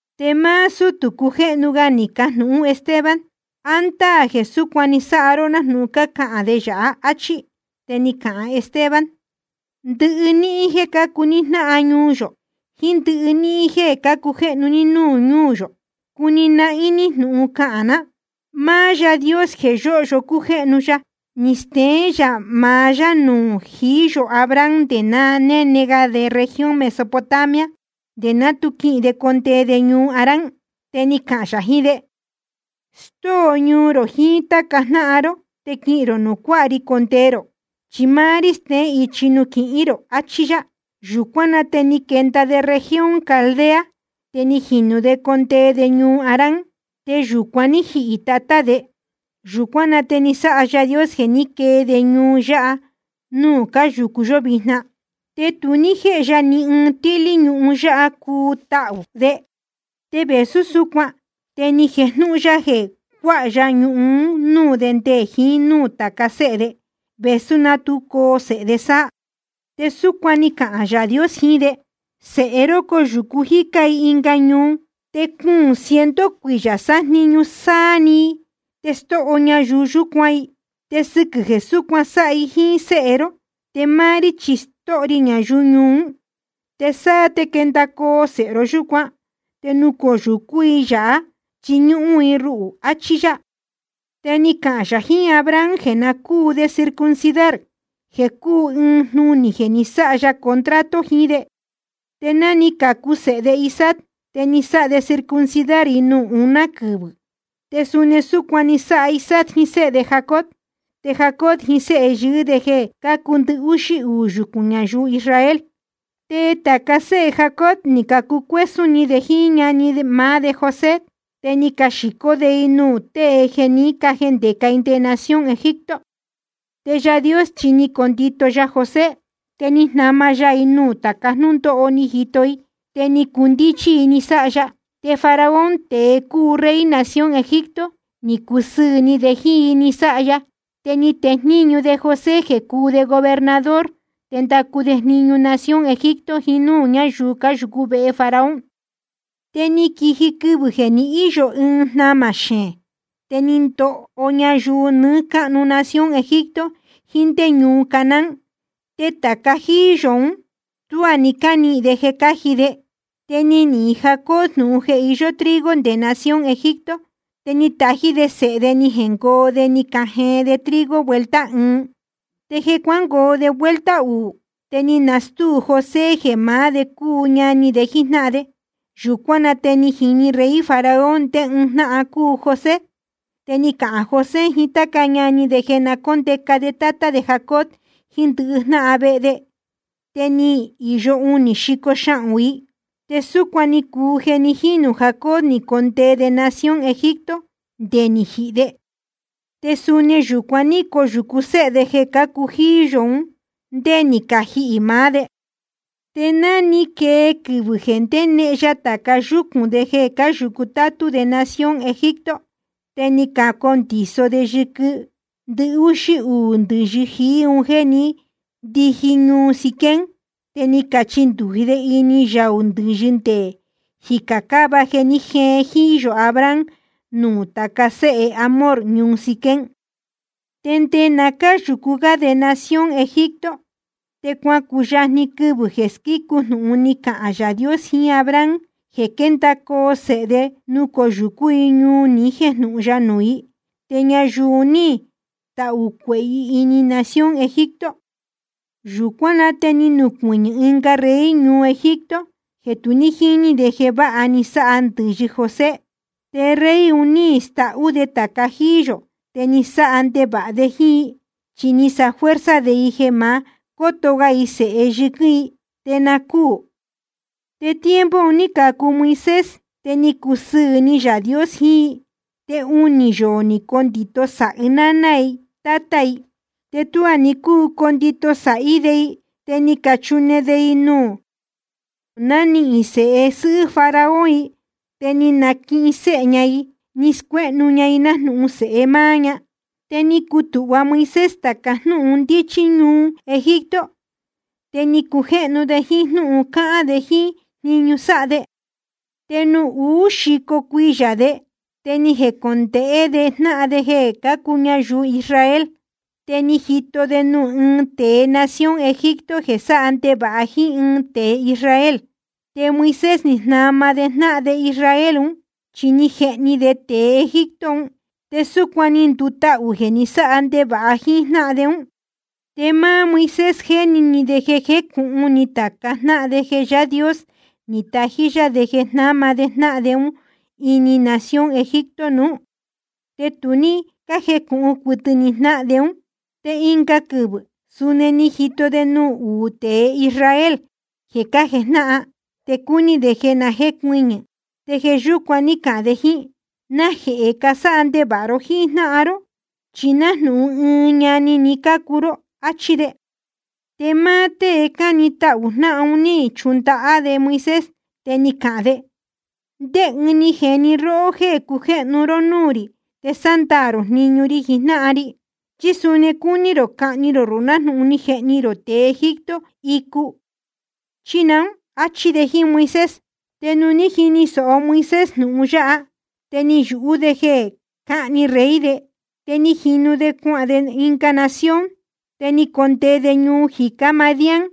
Te máá sútū cujéhnu ga ni cajnūhún Esteban: ¿A ndáā jeē súcuan ni sáha ró nájnūhun cácahān de yāhá? áchí. Te ni cahān Esteban: Ndɨhɨ níhín jéē cácuu ní jnáhan ñuu yō, jíín ndɨhɨ níhín jéē cácujéhnu ní núū ñúū yō, cuni nahín ní jnūhun cahān ná: Máá Yáā Dios jeē yóhyo cújéhnu ya, ni steén yā maá yá nuū jií yō Abraham nde na néne ga de región Mesopotamia, nde ná tu quihīn de condee de ñuu Harán. Te ni cahān yā jiín de: Stóo ñuu rō jiín táca jnáhan ró te quihīn rō nuū cuáha ri condee rō, chi máá rí steén ichi nuū quihín rō, achí yá. Yūcuán na te ni quenda de región Caldea, te ni jinū de ni condee de ñuu Harán. Te yūcuan ní jihī tatá de. Yūcuán na te ni sáha Yaā Dios jeē ní quee de ñuu yáha núū cáyūcu yó vijna. Te tu ní jéhe ya ni ɨɨn tíhlí ñuhun yáha cuu tahū de. Te vēsú súcuan te ni jejnūhun ya jeē cuáha ya ñuhun un núū de nde jiín núū tāca séhe de, vēsú ná tu coo sēhe de sáá. Te súcuan ni cahān Yaā Dios jiín de: Sēhe ró coyūcu jícá i ɨnga ñuu, te cuūn ciento cuiyā sájniñu sáá‑ni i te stóho ñayuu yúcuan i. Te sɨquɨ̄ jeē súcuan sáha i jíín séhe ró, te máá rí chi stóho ri ñayuu ñuu ún. Te sáá te quendacoo sēhe ró yúcuan, te nucoyūcú i yāhá chiñúhún i ruhū, achí yá. Te ni cahān yā jiín Abraham jeē na cúu de circuncidar, jeē cúu ɨɨn jnunī jeē ni sáha ya contrato jiín de. Te ná ni cacu sēhe de Isaac te ni sáha de circuncidar i nuū uná quɨvɨ̄. Te suni súcuan ni sáha Isaac jiín séhe de Jacob, te Jacob jiín séhe yɨɨ́ de jeē cácuu ndɨhúxí uū yucūn ñayuu Israel. ’Te tāca séhe Jacob ni cacucuésún ni de jíín ñani maá de José, te ni caxīcó de i nuū tée jeē ní cajendēca i nde nación Egipto. Te Yaā Dios chi ni ndito ya José. Te ni jnama ya i nuū tāca jnúndóho ní jito i, te ni cundíchí i ni sáha ya. Te Faraón, tēe cúu rey nación Egipto, ni cusɨɨ̄ ni de jíín i ni sáha ya, te ni tejníñu de José jeē cúu de gobernador te ndacu de jniñu nación Egipto jiín núū ñáyuu cáyūcú vehe Faraón. ’Te ni quiji quɨvɨ̄ jeē ni íyo ɨɨn jnamā xeēn, te ni ndoho ñayuu nɨɨ́ cáhnu nación Egipto jiín ndé ñuu Canaán. Te tāca jíí yō ún, tuá ni cánihīn de jeē cáji de. Te ni nihīn Jacob jnūhun jeē iyó trigo nde nación Egipto, te ni tají de sēhe de ni jengoo de ni cajeen de trigo vuelta ɨɨn. Te jeē cuángoo de vuelta uū te ni nastúu José jeē maá de cúu ñani de jíjnáhan de. Yūcuán na te ni jini rey Faraón ndé ɨɨn jnáhan cúu José. Te ni cahān José jiín táca ñani de jeē na cóndeca de tátá de Jacob jiín ndɨhɨ jnáhan vehe de. Te ni īyo unī xico xahūn i. Te súcuan ni cuu jeē ni jínū Jacob ni condee de nación Egipto nde ni jihī de. Te suni yūcuan ní coyūcu séhe de jeē cácuu jíí yō un ndé ni cajihī maá de. Te ná ni quee quɨvɨ̄ jeē ndénehen ya tāca yúcūn de jeē cáyūcu tátú de nación Egipto, te ni cacondiso de yɨquɨ ndɨhúxí uū ndɨ̄yɨ jií un jéē ndíji ñuu Siquem, te ni cachindūji de ini yaū ndɨ̄yɨ ndeé jícā cáva jeē ní jeen jíí yō Abraham nuū tāca séhe Hamor ñuu Siquem. ’Te nde ná cáyūcu gá de nación Egipto, te cuacuyajni quɨvɨ̄ jeē squícu jnūhun ni cahān Yaā Dios jiín Abraham jeē quéndacoo sēhe de nucoyūcú i ñuu ni jéjnūhun ya nuū i, te ñayuu un ní tahū cuehē i ini nación Egipto. Yūcuán na te ni nucuɨñɨ̄ ɨnga rey ñuu Egipto jeē tu ní jíní de jeē váha ni sáha ndɨ̄yɨ José. Te rey un ní stahú de tāca jíí yō te ni sáha ndevāha de jíín i, chi ni sáha fuerza de i jeē ma cóto ga i sēhe yɨquɨ́n i te na cúū. Te tiempo un ní cacu Moisés, te ni cusɨɨ̄ ni Yaā Dios jiín i. Te unī yoō ni condito sāhi náná i tátá i. Te tuá ni cúu condito sāhí de i, te ni cachune de i nuū nanihīn sēhe sɨ́hɨ́ Faraón i, te ni naquihin séhe ña i ni scuéhnu ña i nájnūhun sēhe máá ña. Te ni cutūhva Moisés tāca jnúhun ndíchí ñuu Egipto, te ni cujéhnu de jíín jnúhun cáhán de jíín jniñu sáha de. ’Te nuū uú xico cuiyā de te ni jecondēhé de jnáhan de jeē cácuu ñayuu Israel. Te ni jito de nuū ɨɨn tēe nación Egipto jeē sáha ndevāha jíín ɨɨn tēe Israel. Te Moisés ni jnama de jnáhan de Israel ún, chi ni jehni de tēe Egipto un. Te súcuan ni ndutahū jeē ni sáha ndevāha jíín jnáhan de ún. Te máá Moisés jéni ni de jeē jécūhun ni tāca jnáhan de jeē Yáā Dios ni tají yá de jeē jnáma de jnáhan de ún ini nación Egipto nuú, te tu ní cájecūhun cuɨtɨ ni jnáhan de ún. Te ɨnga quɨvɨ̄ suni ni jito de nuū uú tēe Israel jeē cájejnáhan, te cúní de jeē na jécuɨñɨ̄. Te jeē yúcuan ní cahān de jíín: ¿Najehē casáha ndevāha ró jíín jnáhan ró? Chi nájnūhun ɨɨn ñani‑ni cácuu ró, áchí de. Te máá tée cáni tahū jnáhan un ní chundahá de Moisés te ni cahān de: ¿Ndé ɨɨn ni jeni róhó jéē cujéhnu ró núū rī te sándaā rō jniñu ri jijnáhan ri? ¿Chí suni cúní rō cahni rō ruhū nájnūhun ni jehni rō tēe Egipto icu chí naún? áchí de jíín Moisés. Te nuū ní jini sōho Moisés jnūhun yáha, te ni yūhú de jeē cáhni rey de, te ni jinu de cuahān de ɨnga nación. Te ni condee de ñuu jicá Madián,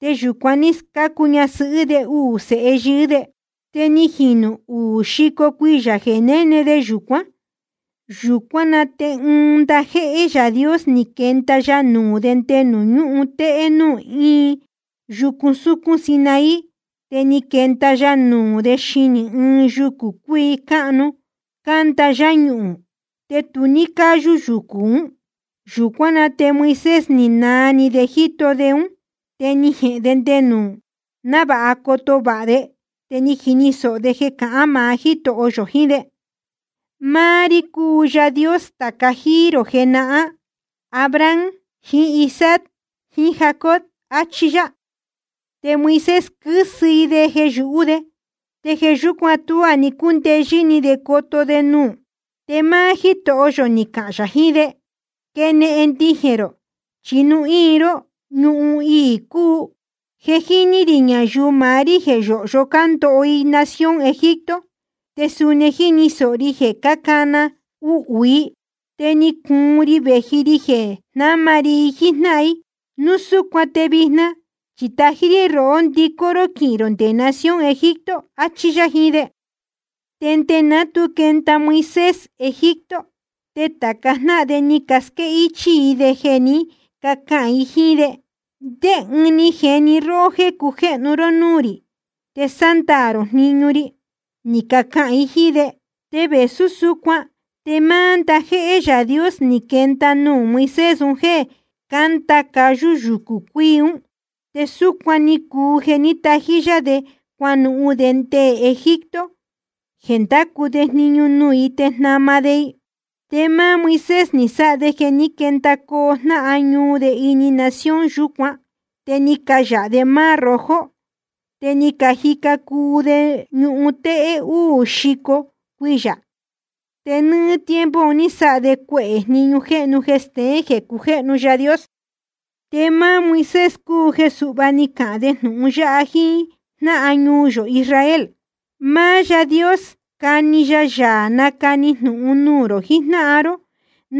te yūcuan ní scácu ñasɨhɨ́ de uū sēhe yɨɨ́ de. ’Te ni jīnu uū xico cuiyā jeē néne de yūcuán. Yūcuán na te ɨɨn ndajéhé Yaā Dios ni quenda ya nuū de nde nuū ñúhun téhé nuū íin yucu súcún Sinaí. Te ni quenda ya nuū de xinī ɨɨn yucū cuíi cáhnu cándahá yáñuhūn, te tu ní cáyú yucū ún. Yūcuán na te Moisés ni naa ni de jíto de ún, te ni jehēn de nde nuū, návāha coto vāha de. Te ni jini sōho de jeē cahán maá Jítoho yō jiín de: Máá rí cúu Yaā Dios tāca jíí rō jenahán, Abraham jiín Isaac jiín Jacob, achí yá. Te Moisés, quɨ́sɨ i de jeē yūhú de, te jeē yúcuan tuá ni cúndeyɨ́ ni de coto de nuū. Te máá Jítoho yō ni cahān yā jiín de: Quenehen ndijēn rō chi nuū íin ró, ñuhun íí cúu. Je ni jini rī ñayuu maá rí jeē yóhyo cándoho i nación Egipto, te suni jíni sōho ri jeē cájnana uhū i, te ni cuun ri vēji ri jeē jnáma ri i jíjnáhan i. Núu súcuan te vijna chi tají rí rohó ndicó ró quihīn rō nde nación Egipto, achí yá jiín de. ’Te nde ná tu quenda Moisés Egipto, te tāca jnáhan de ni casquéhichī i de jeē ní cacahān i jíín de: ¿Ndé ɨɨn ni jeni róhó jéē cujéhnu ró núū rī te sándaā rō jniñu ri? ni cacahān i jíín de. Te vēsú súcuan te máá ndajéhé Yaā Dios ni quenda nuū Moisés un jéē cándahá cáyú yucū cuíi ún. Te súcuan ni cuu jeē ní natají yá de cuanuhun de nde Egipto jeē ndácu de jniñu nuū i te jnama de i. Te máá Moisés ni sáha de jeē ní quendacoo jnáhan ñuu de ini nación yúcuan, te ni cayāha de Mar Rojo, te ni cajica cuu de ñuhun téhé úū xico cuiyā. Te nɨ́ɨ́ tiempo un ní sáha de cuehē jniñu jéhnu jeē steén jeē cujéhnu Yaā Dios. Te máá Moisés cúu jeē suhva ni cahān de jnūhun yáha jíín jnáhan ñuu yō Israel: Máá Yáā Dios cani ya Yaā nacani jnūhun nuū rō jijnáhan ró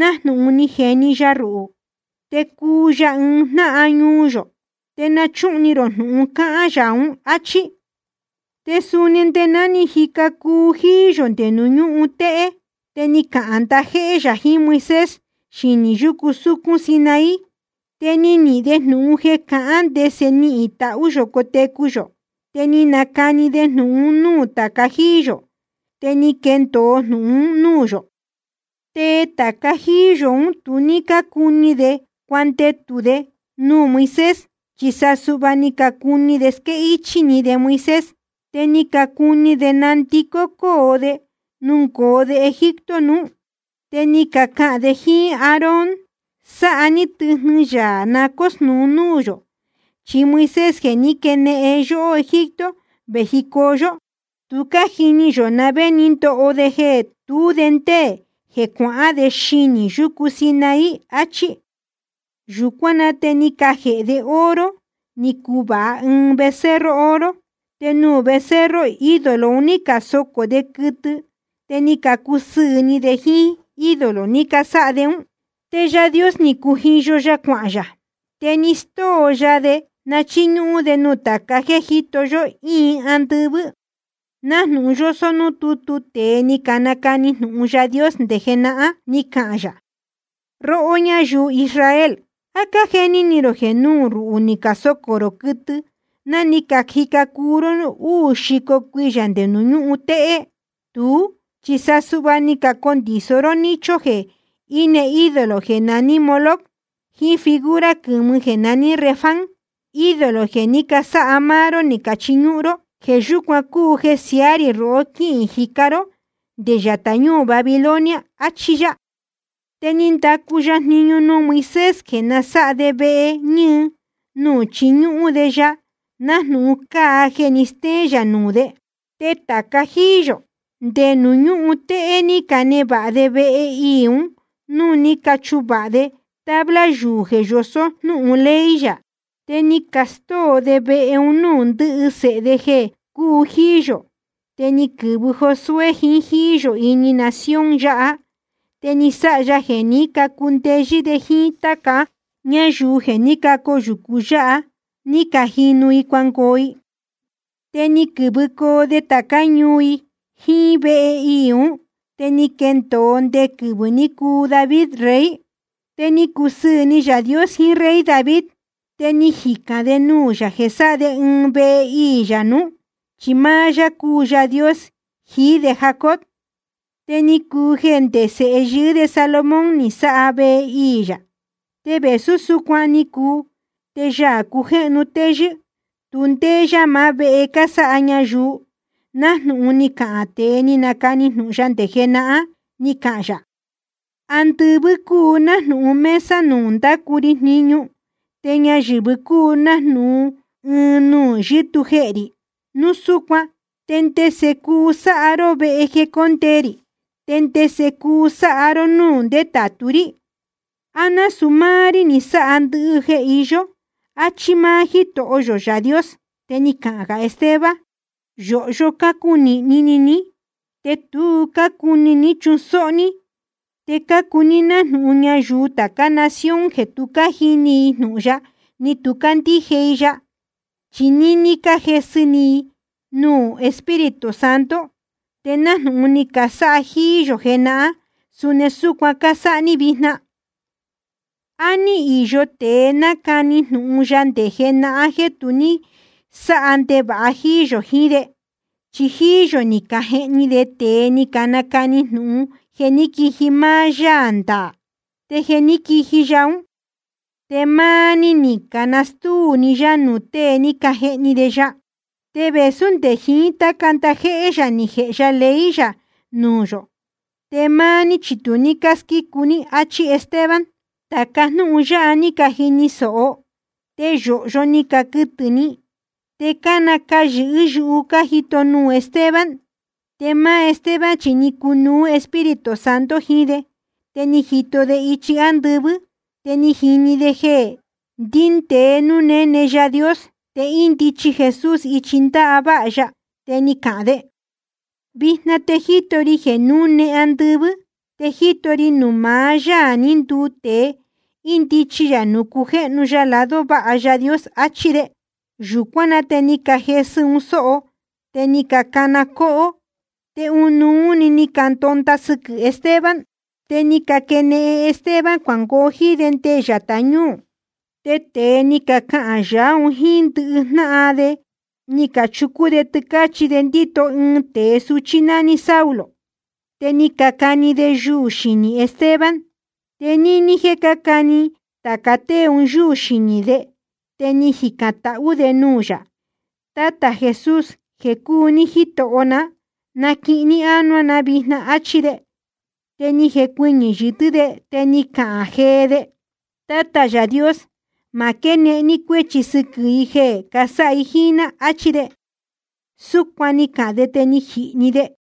nájnūhun ni jeni ya ruhū. Te cuu ya ɨɨn jnáhan ñuu yō. Te na chúhun ni rō jnūhun cahān Yaā ún, áchí. Te suni nde ná ni cajica cuu jíí yō nde nuū ñúhun téhé, te ni cahān ndajéhé yā jiín Moisés xinī yúcu súcún Sinaí, te ni nihīn de jnūhun jeē cahán ndese nihīn tahú yō cotecu yō, te ni nacani de jnūhun un núū tāca jíí yō, te ni quendōo jnūhun un núū yō. ’Te tāca jíí yō ún tu ní cácuni de cuandetū de nuū Moisés, chi sa suhva ni cacuni de squéhichī ni de Moisés, te ni cacuni de nandicó de nungoo de Egipto nuú. Te ni cacahān de jíín Aarón: Sáha ní tɨjnɨ yaā na cósnūu núū yō. Chi Moisés, jeē ní quenehen de yóhó Egipto vējicoo yó, tu cájini yō na vé ni ndoho de jeē tú de ndéē jeē cuahán de xinī yucu Sinaí, achí. Yūcuán na te ni cajēhe de oro ni cuvāha ɨɨn becerro oro, te nuū becerro ídolo un ní casocō de quɨtɨ, te ni cacusɨɨ̄ ni de jíín ídolo ni casáha de ún. Te Yaā Dios ni cujiyo ya cuahān yā, te ni stóo ya de na chíñúhún de nuū tāca jéē jíto yó íin andɨvɨ́, nájnūhun yósó núū tútu tēe ni canacani jnūhun Yaā Dios nde jenahán: Ni cahān yā: Róhó ñáyuu Israel, ¿á cájeni ni rō jeē nuū ruhū ni casocō rō quɨtɨ ná ni cajica cuu ró úū xico cuiyā nde nuū ñúhun téhé? Tuú, chi sa suhva ni cacondiso ró nicho jeē íne ídolo jeē naní Moloc jíín figura quɨ̄mɨ jeē naní Renfán, ídolo jeē ní casáha máá ró ni cachiñúhún ró. Jeē yúcuan cúu jeē siáha ri rohó quíhīn jicá ró nde yatā ñúū Babilonia, achí yá. ’Te ni ndacu ya jniñu nuū Moisés jeē na sáha de vehe ñɨɨ nuū chiñúhún de ya, nájnūhun cáa jeē ní steén yā nuū de. Te tāca jíí yō, nde nuū ñúhun téhé ní canevāha de vehe iī un núū ní cachuvāha de tabla yuū jeē yosó jnúhun ley yā. Te ni castóo de vehe un núū ndɨhɨ sēhe de jeē cúu jíí yō. Te ni quɨ̄vɨ Josué jiín jíí yō ini nación yáha, te ni sáha ya jeē ní cacundeyɨ́ de jíín táca ñáyuu jeē ní cacoyūcu yáha ní cajinu i cuangoo i. Te ni quɨ̄vɨcoo de tācá ñuu i jíín vehe iī ún, te ni quendōo nde quɨvɨ̄ ní cuu David rey. Te ni cusɨɨ̄ ni Yaā Dios jiín rey David. Te ni jicān de nuū yā jeē sáha de ɨɨn vehe iī yā nuú, chi máá yá cúu Yaā Dios jií de Jacob. Te ni cuu jeē nde sēhe yɨɨ́ de Salomón ni sáha vehe iī yā. Te vēsú súcuan ni cuu te Yaā cujéhnu téyɨ́, tu ndéé yá maá vehe jeē casáha ñayuu, nájnūhun ni cahān tēe ni nacani jnūhun ya nde jenahán: Ni cahān yā: Andɨvɨ́ cúu nájnūhun mesa nuū ndácu ri jniñu te ñayɨ̄vɨ cúu nájnūhun ɨɨn nuū yɨ́tuu jehē rī. Núu súcuan ¿te ndese cuu sáha ró vehe jeē cóndee rī, te ndese cuu sáha ró núū ndétātu rí? ¿A násūu máá rí ní sáha ndɨhɨ jeē iyó? áchí máá Jítoho yō Yaā Dios. Te cáhán gā Esteban: Yōhyo cácunīhni ni ní, te tu cácuni ní chusóhó ní, te cácuu ní nájnūhun ñayuu tācá nación jeē tu cájini i jnūhun ya ni tu cácandíje i ya. Chi níní cájesɨ ni núū Espíritu Santo, te nájnūhun ni casáha jíí yō jenahán, suni súcuan cásáha ní vijna. ¿A ní īyo tēe nácani jnūhun ya nde jenahán jeē tu ní sáha ndevāha jíí yō jiín de? Chi jíí yō ni cajehni de tēe ni canacani jnūhun jeē quíji máá Yáā ndaā. Te je ni quiji Yaā ún, te máá ní ni canastúu ni yá nuū tée ni cajehni de ya. Te vēsú nde jiín táca ndajéhé yā ni jēhe ya ley yā nuū yō, te máá ní chi tu cásquícu ní, áchí Esteban. Tāca jnúhun yáha ní cajini sōho, te yōhyo ni caquɨtɨ̄ ni, te cánacayɨ̄hɨ́ yuhu cájito nuū Esteban. Te máá Esteban chi ni cunuú Espíritu Santo jiín de. Te ni jito de ichi ándɨvɨ́, te ni jini de jeē ndíndēe núū néne Yaā Dios, te índichi Jesús ichi ndáváha ya. Te ni cahān de: Vijna te jíto ri jeē núne andɨvɨ́, te jíto ri nuū maá Yáā ní nduu tēe, índichi yā nuū cujéhnu ya lado váha Yaā Dios, áchí de. Yūcuán na te ni cajesɨ un sóho, te ni cacana cóhó, te ɨnuú‑ni ni candonda sɨquɨ̄ Esteban. Te ni caquenehen Esteban cuangoo jíín de nde yatā ñúū. Te tēe ni cacahān yaá un jíín ndɨhɨ jnáhan de ni cachucú de tɨcāchí de ndíto ɨɨn tēe suchí nání Saulo, te ni cacani de yuū xinī Esteban. Te níní jéē cácani tāca tée un yúū xinī de te ni jicān tahú de nuū yā: Tátā Jesús jeē cúu ní Jitoho ná, naquihin ní ánuá na vijna, áchí de. Te ni jecuɨñɨ̄ yɨtɨ́ de te ni cahān jee de: Tátā Yaā Dios, ma quénehen ní cuéchi sɨquɨ̄ i jeē casáha i jíín ná, áchí de. Súcuan ni cahān de te ni jihī‑ni de.